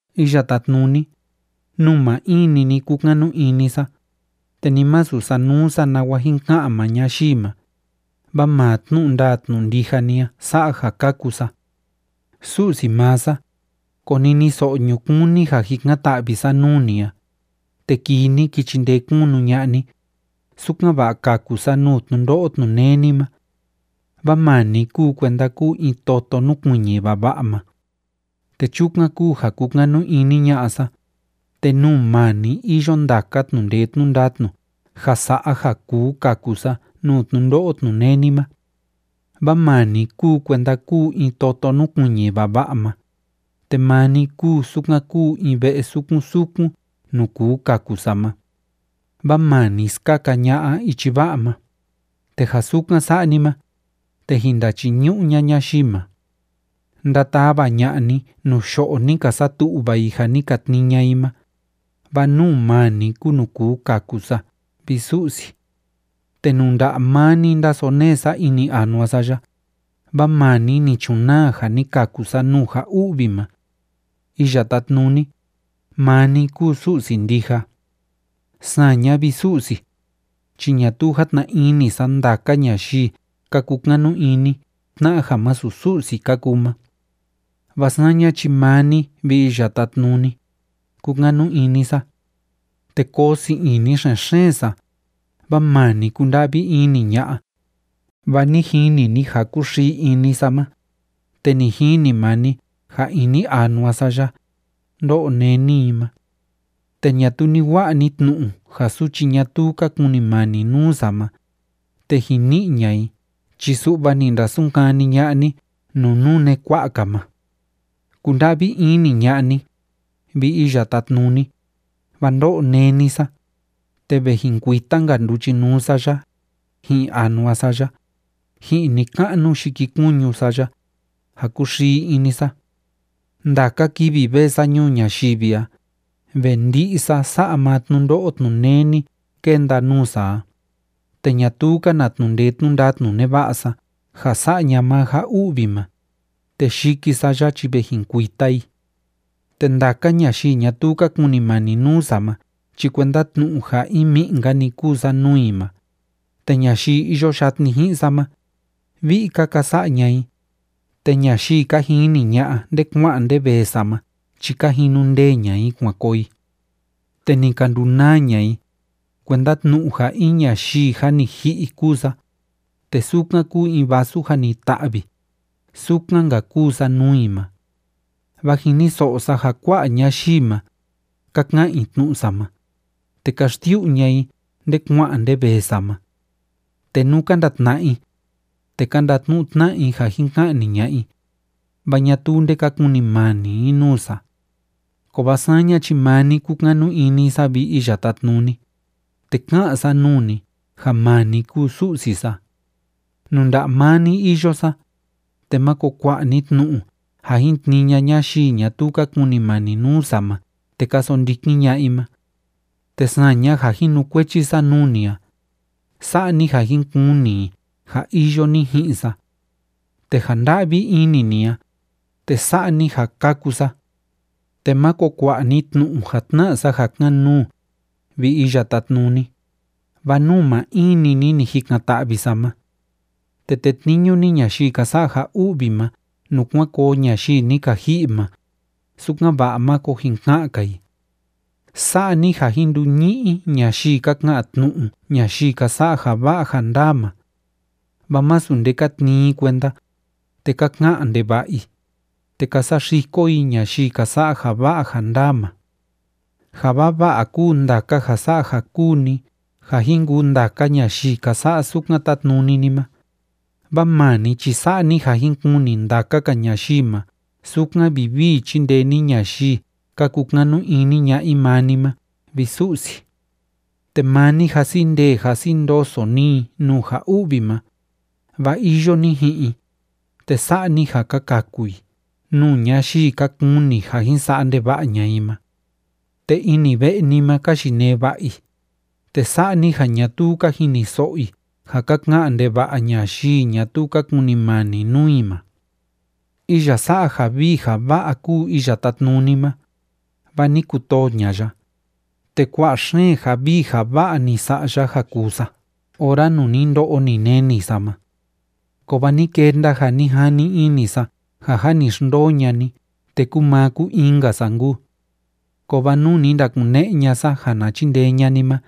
Iya Tátnuni, nuu maa in‑ni ni kúkanu ini sa, te ni masu sanuu sa nawa jin ka'an maa ñayii ma, vaa maa tnu'u ndaa tnu'u ndija ni a sa'a ja kaku sa. Su'si maa sa, koniniso'o ñukuun ni ja jikan‑ta'vi sa nuu ni a, te kii ni ki chindee kunu ña'a ni, sukan‑va'a kaku sa nuu tnundo'o tnuneni ma. Vaa maa ni kúu kuenda kúu in toto núkuiñi vava'a ma, te chukan kúu ja kúkanu ini ña'a sa, te nuu maa ni iyo ndaka tnu'u ndee tnu'u ndatnu ja sa'a ja kuu kaku sa nuu tnundo'o tnuneni ma. Vaa maa ni kúu kuenda kúu in toto núkuiñi vava'a ma, te maa ni kúu sukan kúu in ve'e sukun sukun nuu kuu kaku sa ma, vaa maa ni skaka ña'a ichi va'a ma, te ja sukan sa'a ni ma, te jin ndachiñu'u ña'a ñayii ma. Ndatava ña'a ni nuu yo'o ni ka satu'va i ja ni ka tnii ña'a i ma, vaa nuu maa ni kúu nuu kuu kaku sa, vi Su'si. Te nuu nda'a maa ni ndásonee sa ini anua sa ya, vaa maa ni ni chunaa ja ni kaku sa nuu ja u'vi ma. Iya Tátnuni, maa ni kúu Su'si ndija. Saña, vi Su'si, chi ñatuu játna ini sa ndaka ñayii ka kukanu ini tna'a ja masu Su'si ka kuu ma. Vaa saña chi maa ni, vi Iya Tátnuni, kúkanu ini sa. Te koo sii ini xen‑xeen sa, vaa maa ni kúnda'vi ini ña'a, vaa ni jini ni ja kúxii ini sa ma, te ni jini maa ni ja ini anua sa ya, ndó'o néni i ma. Te ñatuu ni wa'a ni tnu'u ja suchi ñatuu ka kunimani nuu sa ma, te jin ni'i ña'a i chi su'va ni ndasunkani ña'a ni nuu nune kua'a‑ka ma. Kunda'vi ini ña'a ni, vi Iya Tátnuni, vaa ndó'o néni sa, te ve jin kuita‑nka nduchinuu sa ya, ji'in anua sa ya, ji'in ni‑ka'nu yikikuñu sa ya, ja kúxii ini sa. Ndaka kivi vee sa ñuu ñayivi a, ve ndi'i sa sa'a maa tnundo'o tnuneni kénda nuu sa a, te ñatuu‑ka na tnu'u ndee tnu'u ndatnu neva'a sa ja sa'a ña'a maa ja u'vi ma, te yiki sa ya chi ve jin kuita i. Te ndaka ñayii ñatuu ka kunimani nuu sa ma chi kuenda tnu'u ja in mi'i‑nka‑ni kúu sa nuu i ma, te ñayii iyo yatni ji'in sa ma, vi'i‑ka ka sa'a ña'a i, te ñayii ka jini ña'a nde kua'an nde vee sa ma chi ka jinu ndee ña'a i kuan koo i. Te ni ka ndunaa ña'a i, kuenda tnu'u ja in ñayii jâ ni ji'i kúu sa, te sukan kúu in vasu jâ ni ta'vi, sukan‑nka kúu sa nuu i ma. Vaa jiniso'o sa ja kua'a ñayii ma, ka ka'an i tnu'u sa ma, te ka xsiu'u ña'a i nde kua'an nde vee sa ma. Te nú ka ndatna'a i, te ka ndatnu'u tna'a i ja jin ka'ni ña'a i, vaa ñatuu nde ka kunimani i nuu sa. Kovaa saña chi maa ni kúkanu ini sa, vi Iya Tátnuni, te ká'an sa nuu ni ja maa ni kúu Su'si sa. Nuu nda'a maa ni iyo sa, te máko kua'a ni tnu'u ja jin tnii ña'a ñayii ñatuu ka kunimani nuu sa ma te ka sondikin ña'a i ma. Te saña ja jinukuechi sa nuu ni a, sa'a ni ja jin kuni i ja iyo ni ji'in sa. Te ja nda'vi ini ni a, te sa'a ni ja kaku sa. Te máko kua'a ni tnu'u ja tna'a sa ja kan‑nuu, vi Iya Tátnuni, vaa nuu maa in‑ni ni ni jikan‑ta'vi sa ma. Te tetniñu ni ñayii ka sa'a ja u'vi ma nuu kuan koo ñayii ni ka ji'i ma, sukan‑va'a máko jin ka'an‑ka i. Sa'a ni ja jin nduñi'i ñayii ka ka'an tnu'u ñayii ka sa'a ja va'a ja ndaa ma. Vaa másu nde ka tnii i kuenda, te ka ka'an ndeva'a i, te ka saxiko i ñayii ka sa'a ja va'a ja ndaa ma. Ja vava'a kúu ndaka ja sa'a ja kúu ni ja jin kuu ndaka ñayii ka sa'a sukan tátnuni ni ma, vaa maa ni chi sa'a ni ja jin kuni ndaka‑ka ñayii ma sukan vivii chíndee ni ñayii ka kukanu ini ña'a i maa ni ma, vi Su'si. Te maa ni, jasi ndee jasi ndoso ni i nuu ja u'vi ma, vaa iyo ni ji'in i, te sa'a ni ja ka kaku i nuu ñayii ka kuni ja jin sa'a ndeva'a ña'a i ma. Te ini ve'e ni ma ka yinee va'a i, te sa'a ni ja ñatuu ka jiniso'o i ja ka ka'an ndeva'a ñayii ñatuu ka kunimani nuu i ma. Iya sa'a ja vii ja va'a kúu Iya Tátnuni ma, vaa ni kutoo ña'a ya, te kua'a xeen ja vii ja va'a ni sa'a ya ja kuu sa ora nuu ni ndo'o ni neni sa ma. Kovaa ni kenda ja ni jani ini sa ja jâ ni xndoo ña'a ni te kúu maa kúu in‑nka sa nkuu. Kovaa nuu ni ndakune'e ña'a sa ja na chindee ña'a ni ma,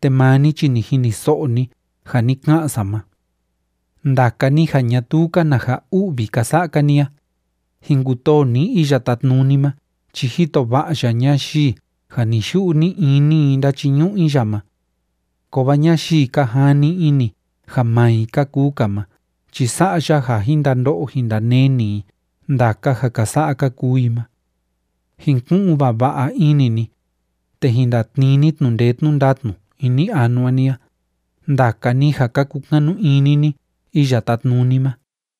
te maa ni chi ni jiniso'o ni ja ni ka'an sa ma. Ndaka ni ja ñatuu‑ka na ja u'vi ka sa'a‑ka ni a, jin kutoo ni Iya Tátnuni ma chi jito va'a ya ñayii ja ni‑yu'u ni‑ini i ndáchiñu'u i ya ma. Kovaa ñayii ka jani ini ja maa i ka kuu‑ka ma chi sa'a ya ja jin ndando'o jin ndaneni i ndaka ja ka sa'a ka kuu i ma. Jin ku'un vava'a ini ni, te jin ndatnii ni tnu'u ndee tnu'u ndatnu ini anua ni a, ndaka ni ja ka kukanu ini ni Iya Tátnuni ma.